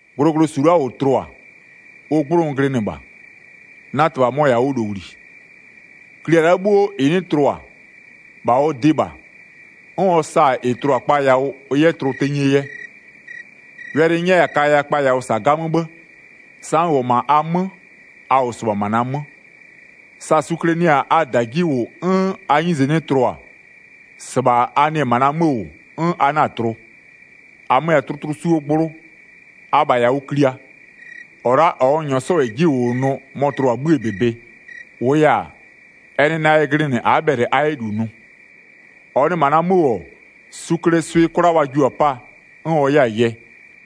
Glʋglʋsu la'a -ʋ tlʋ-a, ʋ 'gblʋ n glɩnɩ -bha, na -Tɩbha mɔ-ɔ -yɛ-a ʋ -lowli. Klia la'a 'bhuo -ɩ 'nɩ tlʋ-a, -bha ɔ dɩɩ -bha, 'n ɔ sa-a -ɩ tlʋ-a kpa yawʋ ɩ 'yɛ tlʋ tenyie yɛ. Wɛlɩ n 'nyɛya-a kaya kpa yawʋ -sa 'gamö 'bhë. Sa n -wʋ-ɔ -ma a 'mö, a -wʋ -sɩbha -ma na 'mö, sa sukle nɩ-a -da 'ji -wʋ 'n a 'nyize 'nɩ tlʋ-a, -sɩbha a nɩ-ɛ -ma na 'mö -wʋ, 'n a 'na-a tlʋ. 5-Amö-ö -yɛ-a tlʋtlʋsuo gblʋ, abha -yɛ-a ʋ klia. -Ɔ la'a -ɔ n -nyɔɔ 'sɔ -yɛ 'ji -wʋwʋnʋ mɔ-ɔ tlʋ-a 'bhïë -bebe. -Wʋʋ yɛ-a, ɛ nɩ na yɛ glɩnɩ a'a bhɛlɩ a 'yɛ -lu nʋ. 6-Ɔ nɩ -ma na 'mö -wʋ-ɔ, suklee swɩ 'kwla wa jio-a 'paa, 'n ɔ 'yɛ-a yɛ.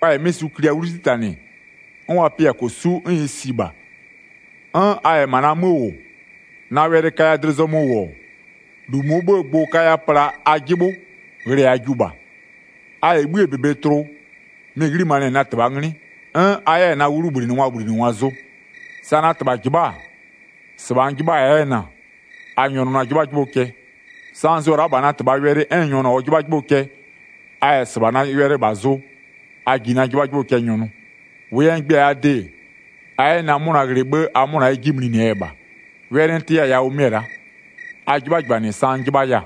Wa -yɛ 'mɩ suklia 'wlu 'titanɩ, 'n wa pɩ-a -kosu'u, 'n ɩ si -bha. 'N a -yɛ -ma na 'mö -wʋ, na wɛlɩ kaya dlɩ zɔmö -wʋ-ɔ, -lu -mʋɔ 'bhëë gbʋ-ʋ kaya pla a 'jɩbhʋ, ghlɩɛ a jiʋ -bha. A -yɛ 'bhïë -bebe tlʋ, mɩ-ɩ 'ghlimanɩɛ na -Tɩbhaa 'nglɩ, 'n a 'yɛ-a na 'wʋbhlinɩngwaa -wʋbhlinɩngwa zʋ. Sa na -Tɩbha -jɩbha'a-a, -sɩbha n 'jɩbhaya 'yɛ-ɛ na-a. A nyɔnʋ na 'jɩbhajɩbhʋ cɛ. Sa n zʋ-ɔ la'a -bha na -Tɩbhaa wɛlɩ 'n n nyɔnʋ-a ɔ 'jɩbhajɩbhʋ cɛ, a -yɛ -sɩbha na wɛlɩ -bha zʋ, a ji na 'jɩbhajɩbhʋ cɛ nyɔnʋ. 11-Wʋʋ yɛ n gbɩ-a a de-e, a 'yɛ na 'mʋna ghlɩ 'bhë a 'mʋna 'yɛ 'ji mlinɩɛ yɛ -bha. Wɛlɩ n tɩya-a yawʋ mɩ-ɛ la'a: A 'jɩbhajɩbhanɩ sa n 'jɩbhaya-a.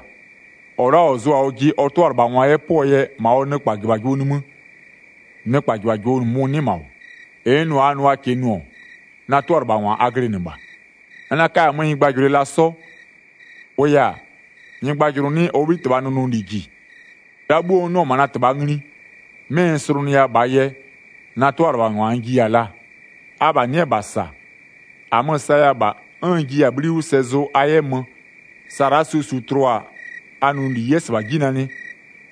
13-Ɔ la'a -ɔ zʋ-a ɔjɩ ɔ 'tʋalɩbhangwa 'yɛ 'pʋɔ yɛ -ma ɔ nɩkpajɩbhajɩbhʋɔ nimï, nɩkpajɩbhajɩbhʋ -mʋmʋ 'nɩ -ma -wʋ. 14-Ɩ n nʋ-a a nʋ a -kɩɩ nʋ-ɔ, na 'tʋalɩbhangwa a glɩnɩ -bha. N 'na-a 'kaya-a 'mö nyɩgbajʋlʋɩ la 'sɔ, -wʋʋ yɛ-a, nyɩgbajʋlʋ 'nɩ ɔ 'bhitɩbhaa nʋnʋli -ji. -Ɩ la'a 'bhuo n 'nʋ-ɔ -ma na -Tɩbha ngli, 'mɩ n slʋnʋya -bhaa yɛ, na 'tʋalɩbhangwa n jiya-a laa. Abha nɩ'ɩ-ɛ -bha -sa, -amö-ö saya-a -bha, 'n n jiya-a 'bhli 'wʋ sɛ zʋ a 'yɛ mö, sa la'a suo su tlʋ-a a nʋnʋli 'yɛ -sɩbha 'ji nanɩ,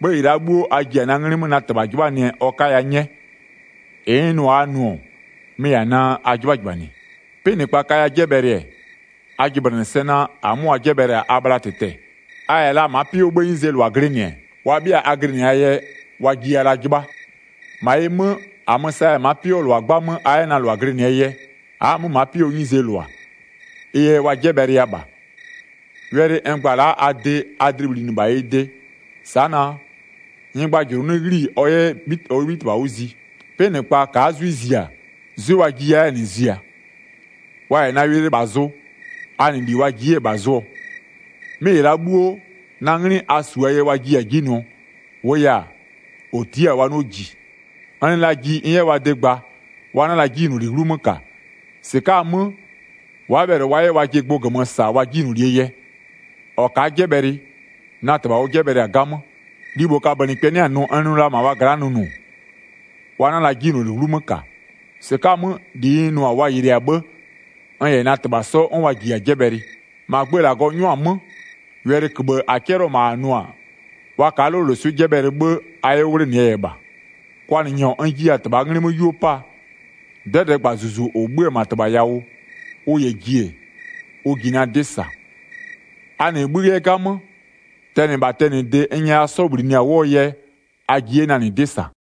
'bhë -ɩ la'a 'bhuo a ji-a na 'nglɩ 'mö na -Tɩbha 'jɩbhanɩɛ ɔ 'kaya 'nyɛ. 17-Ɩ n nʋ-a a nʋ-ɔ, mɩ-ɩ -yɛ-a naa a 'jɩbhajɩbhanɩ. 'Pɩnɩkpa kaya 'jɛbhɛlɩ-ɛ, a jɩblɩnɩ sɛ naa, -amö wa 'jɛbhɛlɩ-a a bhla -tɩtɛ-ɛ. A -yɛ la ma'a 'pɩ 'wʋɔ 'bhëë 'nyizee -lʋa glɩnɩ-ɛ, wa 'bhɩa a glɩnɩ-aa yɛ, wa jiya la 'jɩbha. -Ma ɩ 'mö, -amö-ö saya-a ma'a 'pɩ 'wʋɔ -lʋa 'gbamö a 'yɛ na -lʋa glɩnɩɛ yɛ, a'a-a 'mö ma'a 'pɩ 'wʋɔ 'nyizee -lʋa, ɩ yɛ wa 'jɛbhɛlɩya -bha. Wɛlɩ n gba la-a a de a dlɩ bhlinɩ -bha ɩ de, sa'a naa: Nyɩgbajʋlʋ 'nɩ 'ghli-i ɔ 'yɛ ɔ 'bhitɩbha 'wʋ zi. 'Pɩnɩkpa ka'a 'zwɩ zia, 'zwɩ wa jiya 'yɛ-a -nɩ ziaa. Wa -yɛ na wɛlɩ -bha zʋ, a -nɩ -li -bha wa jiɩ 'yɛ-a -nɩ zʋɔ. 'Mɩ -ɩ la'a 'bhuo, na 'nglɩ a -su-aa yɛ wa jiya-a 'ji nʋɔ. -Wʋʋ yɛ-a, -ɔ tia'a-a wa 'nɩɔ -ji. N nɩ la ji n 'yɛ wa de gba, wa 'na la 'jinyloli 'wlumö -ka. -Sɩka'a-a 'mö, wa'a bhɛlɩ wa 'yɛ wajɩ gbʋ -gömö -sa wa 'jinylolie yɛ. 23-Ɔ ka'a 'jɛbhɛlɩ, na -Tɩbha ɔ 'jɛbhɛlɩ-a 'gamö. Libho kabönɩkpɛ 'nɩ-a nʋ n nʋ la -ma wa gla'a nʋnʋ, wa 'na la 'jinyloli 'wlumö -ka. -Sɩka'a-a 'mö -li n nʋ-a wa yɩlɩɩ-a 'bhë, n -yɛ na -Tɩbha 'sɔ 'n wa -jiya-a 'jɛbhɛlɩ. 25-Ma gbö -Lagɔ 'nyʋa-a 'mö, wɛlɩköbhë -a 'cɛlɩɔ-ɔ -ma -a nʋ-a: Wa ka'a 'loloswɩ'ɩ 'jɛbhɛlɩ 'bhë, a 'yɛ 'wʋ 'wlenɩɛ yɛ -bha. Kwanɩnyɔ n jiya-a -Tɩbhaa 'nglɩ 'mö 'yuo 'paa, 'dɛdɛɛgba -Zuzu -ʋ 'bhö-ö -ma -Tɩbha yawʋ, ʋ -yɛ ji-e, ʋ ji na 'dɩ -sa. A -nɩ 'bhï 'yɛ 'gamö, tɛnɩ -bha tɛnɩde n nyɛya 'sɔ -bhlinɩ-a 'wʋɔ yɛ a ji 'yɛ -nɩ na 'dɩ -sa.